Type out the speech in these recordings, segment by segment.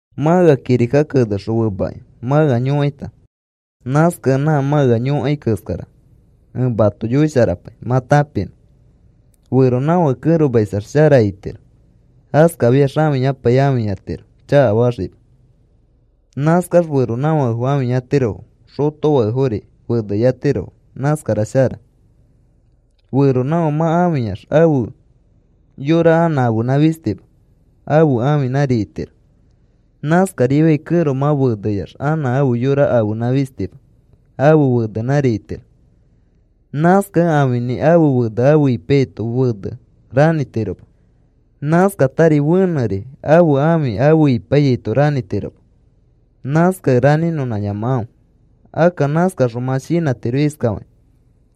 Mã ea kirika kenexõ femakĩ mã ea yõkaita. Nãskakẽ nã mã ea yõkai keskara ẽ mato yoisharapai mã tãpinõ. Feronãfãke kẽromaisax shara itiro. Askafiax ãfiyapai ãfiyatiro chakafaxikĩma. Nãskax feronãfakefo ãfiyatirofo. Xotofakefori feneyatirofo. Nãskara shara. Feronãfake mã ãfiyax ãfe yora anã ãfenã fistima. Ãfe ãfinãri itiro. Nãskarifiai kẽro mã feneyax anã ãfe yora ãfenã fistima. Ãfe fenenãri itiro. Nãskakẽ ãfinĩ ãfe fene afe ipaiyaito fene ranĩtiroma. Nãskatari fenẽri ãfe ãfi afe ipaiyaito ranĩtiroma. Nãskakẽ ranĩnõnãyamakãfe. Akka nãskaxõ mã shinãtiro iskafakĩ: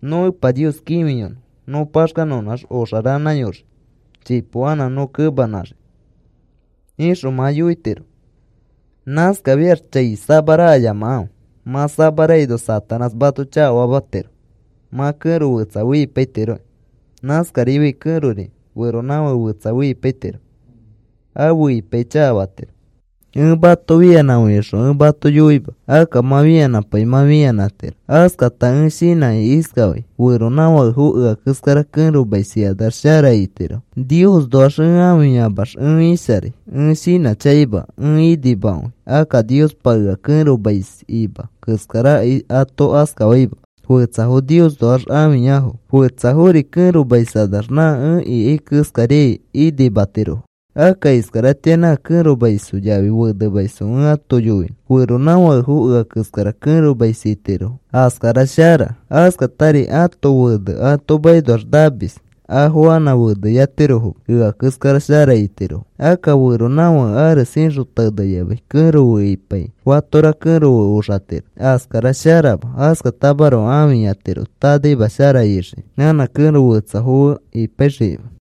“Nõ Epa Nios kĩfiyonõ, nõ paxkanõnãx oxa ranãyoxikĩ. Chipo anã nõ kemãnãxikĩ,” ixõ mã yoitiro. Nãskafiax chai samarakayamakãfe. Mã samarakaino Satanás mato chakafamatiro mã kẽro fetsa fe ipaitirokĩ. Nãskarifiai kẽrori feronãfake fetsa fe ipaitiro. Afe ipaikĩ chakafatiro. Ẽ mato, “Fianãkãfe,” ixõ ẽ mato yoima. Akka mã fianãpai mã fianãtiro. Askata ẽ shinãkĩ iskafai: “Feronãfakefo ea keskara kẽromais ikanax shara itirofo. Niosnoax ẽ ãfiyamax ẽ isharai. Ẽ shinãchakaima. Ẽ inimakõi. Akka Niospa ea kẽromais ima keskarakai ato askafaima. Fetsafo Niosnoax ãfiyafo. Fetsafori kẽromaiskanax nã ẽ ikai keskariai inimatirofo.” Akka iskaratĩa nã kẽromaisfo yafi fenemaisfo ẽ ato yoinõ. Feronãfakefo ea keskara kẽromais itirofo. Askatari kẽrofori fenemais itirofo. Askara shara. Askatari ãto fene ato makinoax namis, afo anã feneyatirofoma. Ea keskara shara itirofo. Akka feronãfake ares ixõ teneyamai kẽro fe ipaikĩ fatora kẽro fe oxatiro. Askara sharama. Askatamaroko ãfiyatiro tanaima shara ixikĩ, anã kẽro fetsafo fe ipaixikĩma.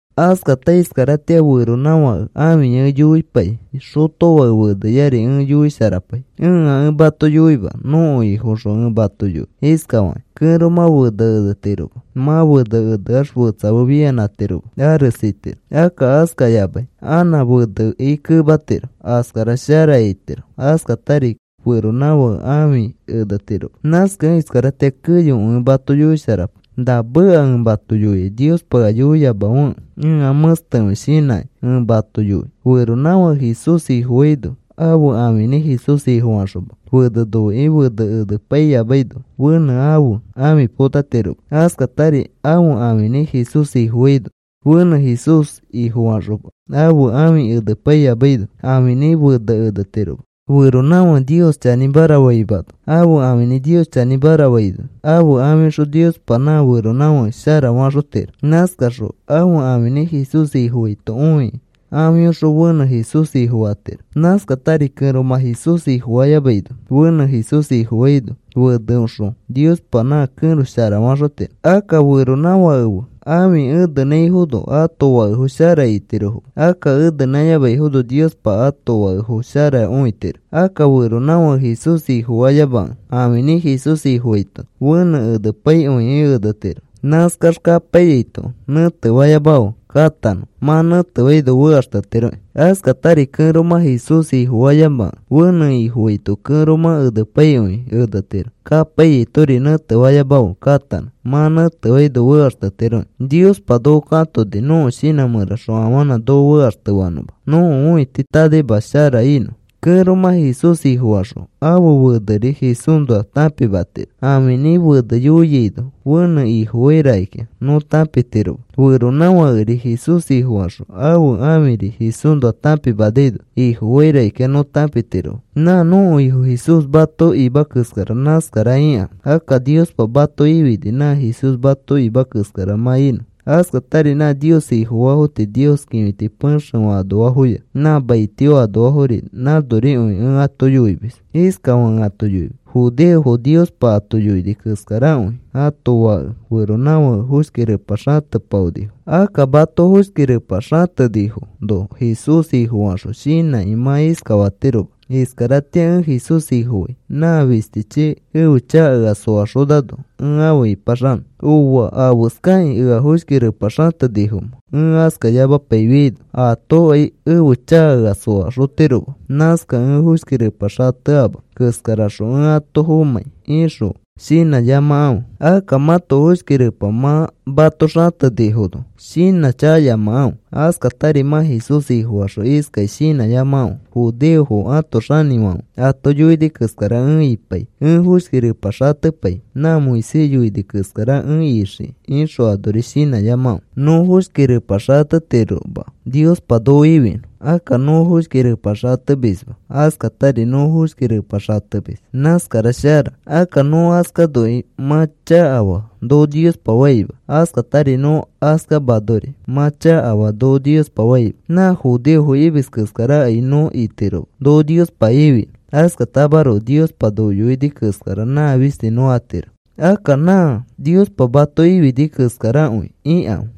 Askata iskaratĩa feronãfake ãfiya ẽ yoipai, xotofãke feneyari ẽ yoisharapai. Ẽa ẽ mato yoima. Nõko Ifoõxõ ẽ mato yoi iskafakĩ, kẽromã fene enetiroma. Mã fene eneax fetsa fe fianãtiroma. Ares itiro. Akka askayamai anã feneki kematiro. Askara shara itiro. Askatari feronãfãke ãfi enetiroma. Nãskakẽ iskaratĩa keyokõi ẽ mato yoisharapai. Na meka ẽ mato yoiai Niospa ea yoiyamafekẽ ẽa mẽstekõi shinãkĩ ẽ mato yoi. Feronãfãke Jesús Ifofaino ãfe ãfinĩ Jesús Ifofaxoma fene noikĩ fene enepaiyamaino fenẽ ãfe ãfi potatiroma. Askatari ãfe ãfinĩ Jesús Ifofaino fenẽ Jesús Ifofaxoma ãfe ãfi enepaiyamaino ãfinĩ fene enetiroma. Feronãfãke Nios chanĩmara faimano ãfe ãfinĩ Nios chanĩmara faino ãfe ãfiõxõ Niospa nã feronãfake shara faxotiro. Nãskaxõ ãfe ãfinĩ Jesús Ifofaito õikĩ ãfiõxõ fenẽ Jesús Ifofatiro. Nãskatari kẽromã Jesús Ifofayamaino fenẽ Jesús Ifofaino feneoxõ Niospa nã kẽro shara faxotiro. Akka feronãfake fe ãfi enenãifono ãto fakefo shara itirofoma. Akka enenãyamaifono Niospa ãto fakefo shara õitiro. Akka feronãfãke Jesús Ifofayamakẽ ãfinĩ Jesús Ifofaito fenẽ enepaikõikĩ enetiro. Nãskax kapaiyaito nẽtefayamafe. Katanõ. Mã nẽtefaino fekaxtetiroki. Askatari kẽromã Jesús Ifofayamakẽ fenẽ Ifofaito kẽromã enepaikõikĩ enetiro. Kapaiyaitori nẽtefayamafe. Katanõ. Mã nẽtefaino fekaxtetiroki. Niospa noko katoni nõko shinã mẽraxõ afanã noko fekaxtefanõma nõko õiti tanaimakõi shara inõ. Kẽromã Jesús Ifofaxõ ãfe feneri Jesúsnoa tãpimatiro ãfinĩ fene yoiaino fenẽ Ifofai rakikĩa nõ tãpitiroma. Feronãfãkeri Jesús Ifofaxõ ãfe ãfiri Jesúsnoa tãpimaino Ifofai rakikĩa, nõ tãpitiroma. Nã nõko Ifo Jesús mato ima keskara nãskara ikãfe. Akka Niospa mato ifini nã Jesús mato ima keskara mã inõ. Askatari nã Nios Ifofaafo tii Nios kĩfiti pexefã anoafoya nã maitio anoafori nãnorikõi ẽ ato yoimis. Iskafakĩ ẽ ato yoimis. Judeofo Niospa ato yoini keskarakõi ãto fake feronãfakefo foshki repa xatepaonifo. Akka mato foshki repa xatenifono Jesús Ifofaxõ shinãkĩ mã iskafatiroma: “Iskaratĩa ẽ Jesús Ifofai. Nã fistichi ẽfe chaka ea soaxonano ẽ afe ĩpaxanõ. Ooa, ¿afeskakĩ ea foshki repa xatenifomẽ, ẽ askayamapaifiaino? Aatokai ẽfe chaka ea soaxotiroma. Nãskakẽ ẽ foshki repa xateama keskaraxõ ẽ ato fomãi,” ixõ shinãyamakãfe. Akka mãto foshki repa mã mato xatenifono shinãchakayamakãfe. Askatari mã Jesús Ifofaxõ iskakĩ shinãyamakãfe: “Judeofo ãto xinifãfe ato yoini keskara ẽ ipai. Ẽ foshki repa xatepai nã Moisés yoini keskara ẽ ixikĩ,” ixõ anori shinãyamakãfe. Nõ foshki repa xatetiroma Niospa noko ifinõ. Akka nõ foshki repa xatemisma askatari nõ foshki repa xatemis nãskara shara. Akka nõ askanokai, “Mã chakafaa,” noko Niospa faima. Askatari nõ askamanori, “Mã chakafaa,” noko Niospa faima. Nã judeofo imis keskarakai nõ itiroma noko Niospa ifinõ. Askatamaroko Niospa noko yoini keskara nã fisti nõ atiro. Akka nã Niospa mato ifini keskarakõi ikãfe.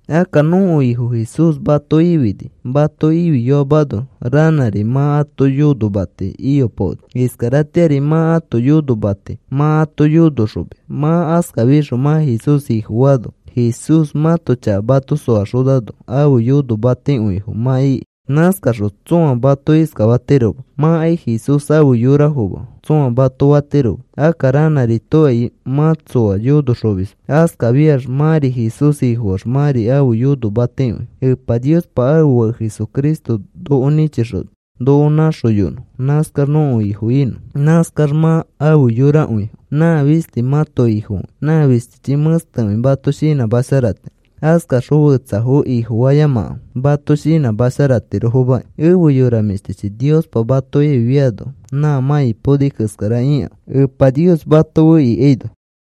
Akka nõko Ifo Jesús mato ifini. Mato ifiyoamano ranãri mã ãto yonomati iyopaoni. Iskaratĩari mã ãto yonomati mã ato yonoxomis. Mã askafixõ mã Jesús Ifofaano, Jesús mãto chaka mato soaxonano, ãfe yonomatikõifo mã iki. Nãskaxõ tsõa mato iskafatiroma: “Mãkai Jesús afe yorafoma,” tsõa mato fatiroma. Akka ranãritokai mã tsõa yonoxomisma. Askafiax mãri Jesús Ifofaax mãri ãfe yonomatikõifo. Epa Niospa ãfe Fake Jesucristo noko nĩchixoni noko nãxoyonõ nãskax nõko Ifo inõ. Nãskax mã afe yorakõifo. Nã fisti mãto Ifokõi. Nã fistichi mẽstekõi mato shinãmasharatiro. Askaxõ fetsafo ifofayamakãfe mato shinãmasharatirofomaki. Efe yora mĩshtichi, Niospa mato ifiano nã mã ipaoni keskara ikãfe Epa Nios mato fe ikaino.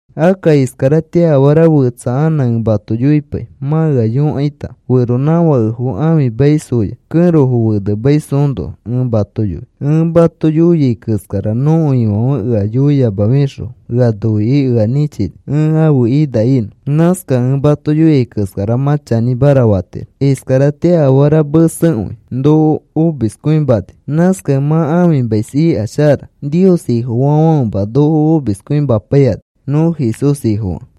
Akka iskaratĩa afara fetsa anã ẽ mato yoipai mã ea yõkaita. Feronãfakefo ãfimaisfoya kẽrofo fenemaisfoõnoa ẽ mato yoi. Ẽ mato yoiai keskara nõko Ifãfe ea yoiyamafixõ ea noikĩ ea nĩchini ẽ ãfe ina inõ. Nãskakẽ ẽ mato yoiai keskara mã chanĩmara fatiro. Iskaratĩa afara mesekõikĩ noko omiskõimani. Nãskakẽ mã ãfimais ika shara. Nios Ifofaafãfema noko omiskõimapaikani nõ Jesús Ifofakẽ.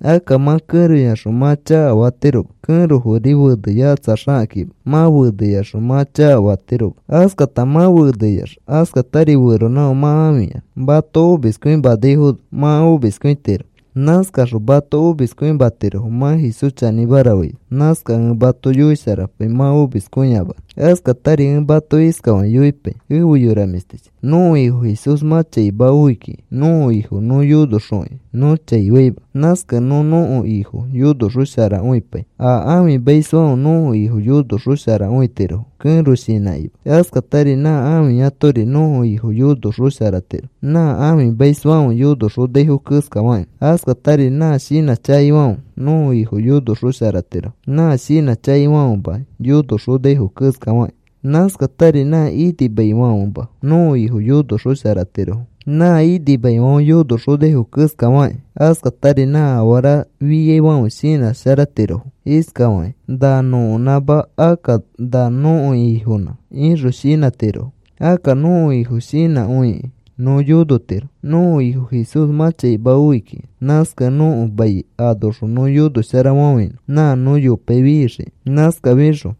Akka mã kẽroyaxõ mã chakafatiroma. Kẽrofori feneyakatsaxakĩma mã feneyaxõ mã chakafatiroma. Askata mã feneyax askatari feronãfake mã ãfiyax mato omiskõimanaifono mã omiskõitiro. Nãskaxõ mato omiskõimatirofo mã Jesús chanĩmara faino. Nãskakẽ ẽ mato yoisharapai mã omiskõiyamanõ. Askatari ẽ mato iskafakĩ yoipai, efe yora mĩshtichi. Nõko Ifo Jesús mã chaima oi kiki. Nõko Ifo nõ yonoxokĩ nõ chai faima. Nãskakẽ nõ nõko Ifo yonoxosharakõipai. A ãfimaisfãfe nõko Ifo yonoxosharakõitirofo kẽro shinãkima. Askatari nã ãfiyatori nõko Ifo yonoxosharatiro nã ãfimaisfãfe yonoxonaifo keskafakĩ. Askatari nã shinãchakaifãfe nõko Ifo yonosharaxotirofo nã shinãchakaifãfema yonoxonaifo keskafakĩ. Nãskatari nã inimaifãfema nõko Ifo yonoxosharatirofo nã inimaifãfe yonoxonaifo keskafakĩ. Askatari nã afara fiaifãfe shinãtirofo iskafakĩ: “Na nõkonãma, akka na nõko Ifonã,” ixõ shinãtirofo. Akka nõko Ifo shinãkõikĩ nõ yonotiro. Nõko Ifo Jesús mã chaima oi kiki. Nãskakẽ nõko mai anoxõ nõ yonosharafafãinõ nã nõ yopai fixiki. Nãskafixõ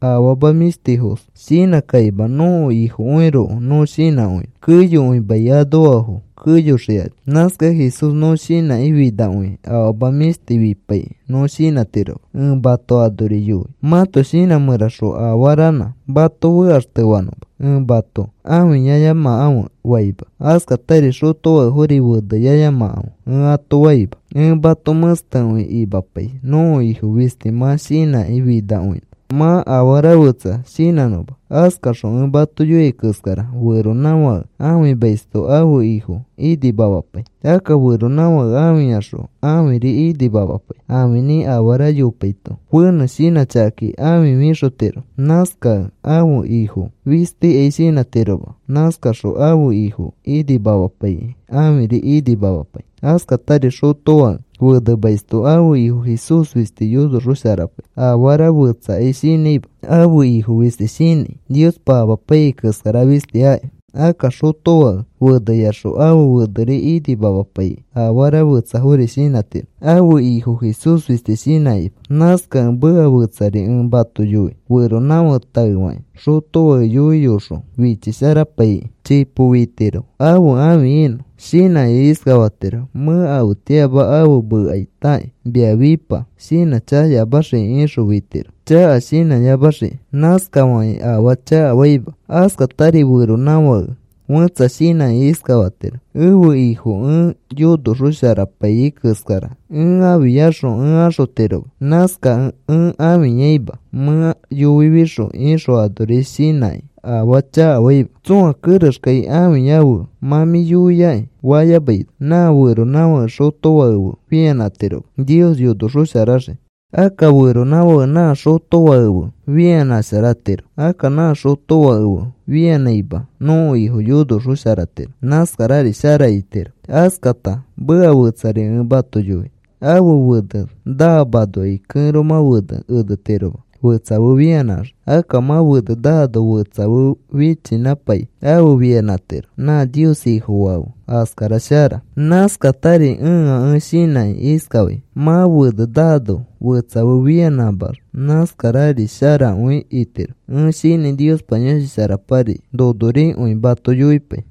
afama mĩshtifos shinãkima nõko Ifokõiroko nõ shinãkõinõ. Keyokõi mai anoafo keyoxikani. Nãskakẽ Jesús nõ shinãkĩ finakõikĩ afama mĩshti fipaikĩ nõ shinãtiroma. Ẽ mato anori yoi mãto shinã mẽraxõ afaranã mato fekaxtefanõma. Ẽ mato, “Ãfiyayamakãfe,” faima. Askatari xotofakefori, “Feneyayamakãfe,” ẽ ato faima. Ẽ mato mẽstekõi imapai nõko Ifo fisti mã shinãkĩ finakõinõ, mã afara fetsa shinãnõma. Askaxõ ẽ mato yoia keskara feronãfake ãfimaisto ãfe Ifo inimamapai. Akka feronãfãke ãfiyaxõ ãfiri inimamapai. Ãfinĩ afara yopaito fenẽ shinãchakakĩ ãfi fixotiro. Nãskakĩ ãfe Ifo fistikai shinãtiroma. Nãskaxõ ãfe Ifo inimamapaikĩ ãfiri inimamapai. Askatari xotofake fenemaisto ãfe Ifo Jesús fisti yonoxosharapai. Afara fetsakai shinãima ãfe Ifo fisti shinãi. Niospa amapaiyai keskara fisti aki. Akka xotofake feneyaxõ ãfe feneri inimamapaikĩ afara fetsafori shinãtiro ãfe Ifo Jesús fisti shinãkĩma. Nãskakẽ meka fetsari ẽ mato yoi. Feronãfãke taefakĩ xotofake yoiyoxõ fichisharapaikĩ chipo fitiro ãfe ãfi inõ. Shinãkĩ iskafatiro: “Mẽ afetĩama afe mekaitakĩ, mia fipa,” shinãchakayamaxiki ixõ fitiro, chaka shinãyamaxiki. Nãskafakĩ afaa chakafaima. Askatari feronãfake fẽtsa shinãkĩ iskafatiro: “Ẽfe Ifo ẽ yonoxosharapaiyai keskara ẽ ãfiyaxõ ẽ axotiroma. Nãskakẽ ẽ ãfiyaima mẽ yoifixõ,” ixõ anori shinãkĩ afaa chakafaima. Tsõa kerexkai, “Ãfiyafe, mã mĩ yoiaki,” fayamaino nã feronãfãke xotofake fe fianãtiroma Nios yonoxosharaxii. Akka feronãfake nã xotofake fe fianãsharatiro. Akka nã xotofake fe fianãima nõko Ifo yonoxosharatiro. Nãskarari shara itiro. Askata meka fetsari ẽ mato yoi. Ãfe fene naamanokai kẽromã fene enetiroma fetsa fe fianãxiki. Akka mã fene naano fetsa fe fichinãpai afe fianãtiro nã Nios Ifofaa fe. Askara shara. Nãskatari ẽa ẽ shinãkĩ iskafai. Mã fene naano fetsa fe fianãmax nãskarari sharakõi itiro. Ẽ shinãi Niospa Yõshi Sharapari nonorikõi mato yoipai.